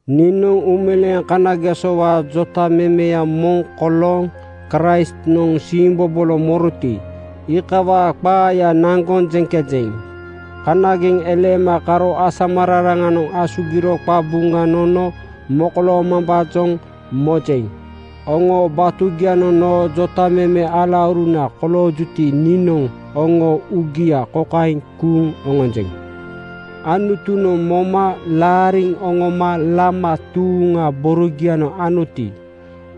Niinoŋ uumeleeŋ kanagesowaa jotamemeya moŋ kolooŋ Kraistnoŋ siimbobolo moroti, iikawaa qaaya naŋgoŋ jeŋkejeŋ. Kanageŋ eleema karo asamararaŋanoŋ asugiro qabuŋa nono mokoloomambaajoŋ mojeŋ. Oŋoo batugianoŋ noo jotameme alauruna koloojuti, niinoŋ oŋoo uugia kokaeŋ kuuŋ oŋonjeŋ: Anutunoŋ moma laariŋ oŋoma lama tuuŋa borogianoŋ anoti,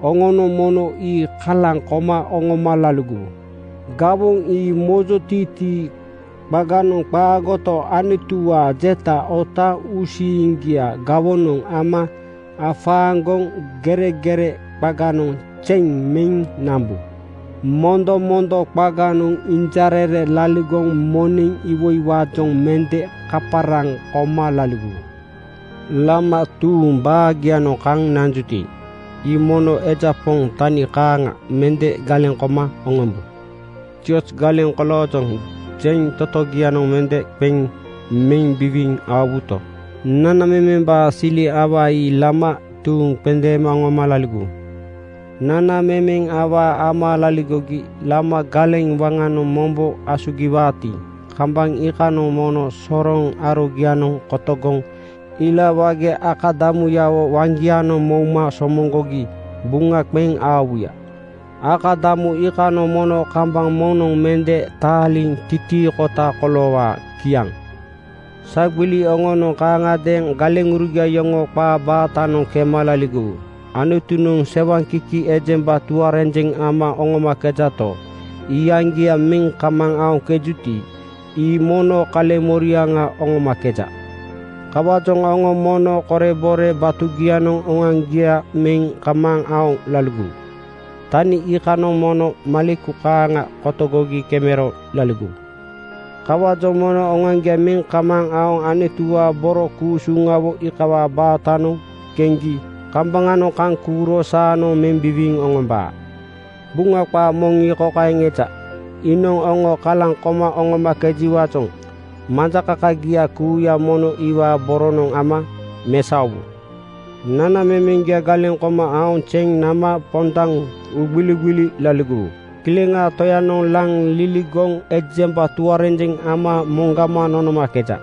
oŋonoŋ mono ii kalaŋ koma oŋoma laligowu. Gawoŋ ii mojotiitii qaganoŋ qaagoto, Anutuwaa jeta otaaŋ uusiiŋgia gawonoŋ ama afaaŋgoŋ geregere qaganoŋ zeŋ meŋ nambu. Mondomondo qaganoŋ injarere laligoŋ moneŋ iwoiwaajoŋ mende kaparaŋ koma laligowu. Lama tuuŋ baagianoŋ kaŋ nanjuti, ii mono eja poŋ tani kaaŋa mende galeŋ koma oŋombu. “Zioz galeŋ koloojoŋ,” jeŋ totogianoŋ mende qeŋ meŋ biwiiŋ aowuto, nanamemembaa sili awaa ii lama tuuŋ qendeema oŋoma laligowu. Nanamemeŋ awaa ama laligogi lama galeŋ waŋanoŋ mombo asugiwaati, kambaŋ iikanoŋ mono soroŋ arogianoŋ kotogoŋ ila wage akadamuyawo waŋgianoŋ mouma somoŋgogi buŋa qeŋ aowuya. Akadamu iikanoŋ mono kambaŋ moŋnoŋ mende taaliŋ titiikota koloowaa. Kiaŋ. Sagbili oŋonoŋ kaaŋagadeeŋ galeŋurugia yoŋoo qaa baatanoŋ kema laligowu. “Anutunoŋ sewaŋkiki ejemba tuarenjeŋ ama oŋomakejato, iyaŋgia meŋ kamaaŋ aoŋkejuti, ii mono kaleŋmoriaŋa oŋomakeja.” Kawaajoŋ oŋo mono korebore batugianoŋ oŋoaŋgia meŋ kamaaŋ aoŋ laligowu. Tani iikanoŋ mono maleku kaaŋa kotogogi kemero laligowu. Kawaajoŋ mono oŋoaŋgia meŋ kamaaŋ aoŋ Anutuwaa boro ku-usuŋawo iikawaa baatanoŋ keŋgi kambaŋanoŋ kaŋ kuuro saanoŋ meŋ biwiiŋ oŋombaa. Buŋa qaa moŋ ii kokaeŋ eja, “Iinoŋ oŋo kalaŋ koma oŋomakejiwaajoŋ majakakagia kuuya mono iwaa boronoŋ ama mesaowu.” Nanamemeŋgia galeŋ koma aoŋ zeŋ nama pondaŋ uugbiligbili laligowu. Kileŋaa Toyanoŋ laŋ liligoŋ ejemba tuarenjeŋ ama moŋgama nonomakeja.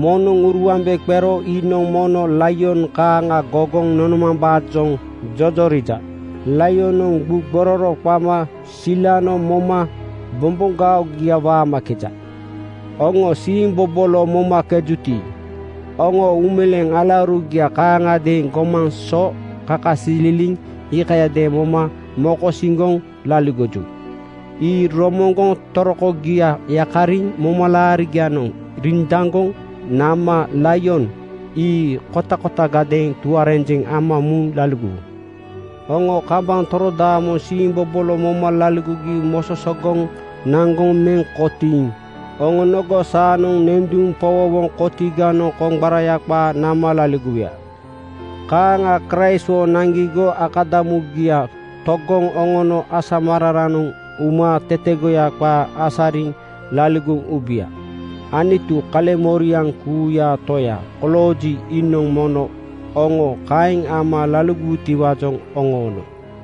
Moŋnoŋ uruambe qero iinoŋ mono laion kaaŋa gogoŋ nonomambaajoŋ jojorija. (Laionoŋ gbuu gbororo qama silano moma bomboŋgaogia waamakeja.) Oŋo siimbobolo momakejuti, oŋoo uumeleeŋ alaurugianoŋ kaaŋiadeeŋ gomaŋ so kakasililiŋ iikayadeeŋ moma mokosiŋgoŋ laligoju. Ii romoŋgoŋ torokogia yakariŋ momalaarinoŋ rindaŋgoŋ nama laion ii kotakotagadeeŋ tuarenjeŋ ama muŋ laligowu. Oŋo kambaŋ torodaamoŋ siimbobolo moma laligogi mososoŋgoŋ naŋgoŋ meŋ kotiiŋ oŋonogo saanoŋ nenduŋ powowoŋ kotiganoŋ koŋgbaraya qaa nama laligowuya. Kaaŋa Kraistwo naŋgigo akadamuya togoŋ oŋono asamararaŋanoŋ uma tetegoya qaa asariŋ laligoŋ ubuya. Anutu, kaleŋmoriaŋ kuuyaa Toya kolooji, iinoŋ mono oŋo kaeŋ ama laligowutiwaajoŋ oŋoono.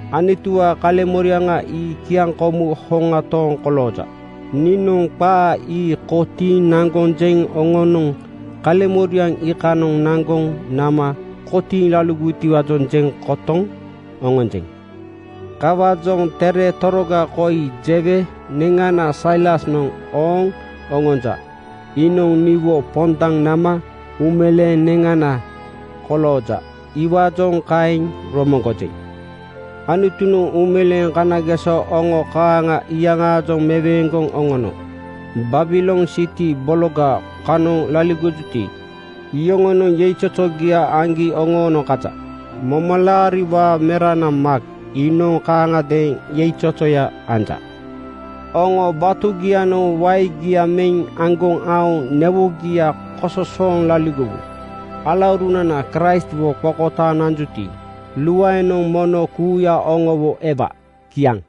Anutuwaa kaleŋmoriaŋ ii kiaŋkomu hoŋa tooŋ kolooja. Niinoŋ qaa ii kotiiŋ naŋgoŋ jeŋ oŋonoŋ kaleŋmoriaŋ iikanoŋ naŋgoŋ nama kotiiŋ laligowutiwaajoŋ jeŋ kotoŋ oŋonjeŋ. Kawaajoŋ tere toroga koi jewe neŋana Sailasnoŋ ooŋ oŋonja. Iinoŋ niwo pondaŋ nama uumeleeŋ neŋana kolooja. Iwaajoŋ kaeŋ romoŋgojeŋ. Anutunoŋ uumeleeŋ kanageso oŋo kaaŋa iyaŋaajoŋ meweeŋgoŋ oŋono Babilon siti bologa kanoŋ laligojuti, iyoŋonoŋ yeizozogia aŋgi oŋoonoŋ kaja. Momalaariwaa merana Maak iinoŋ kaaŋagadeeŋ yeizozoya anja. Oŋo batugianoŋ waegia meŋ aŋgoŋ aoŋ newogia kososooŋ laligowu. Alaurunana Kraistwo qokotaaŋ nanjuti, luaenoŋ mono kuuya oŋowo ewa. Kiaŋ.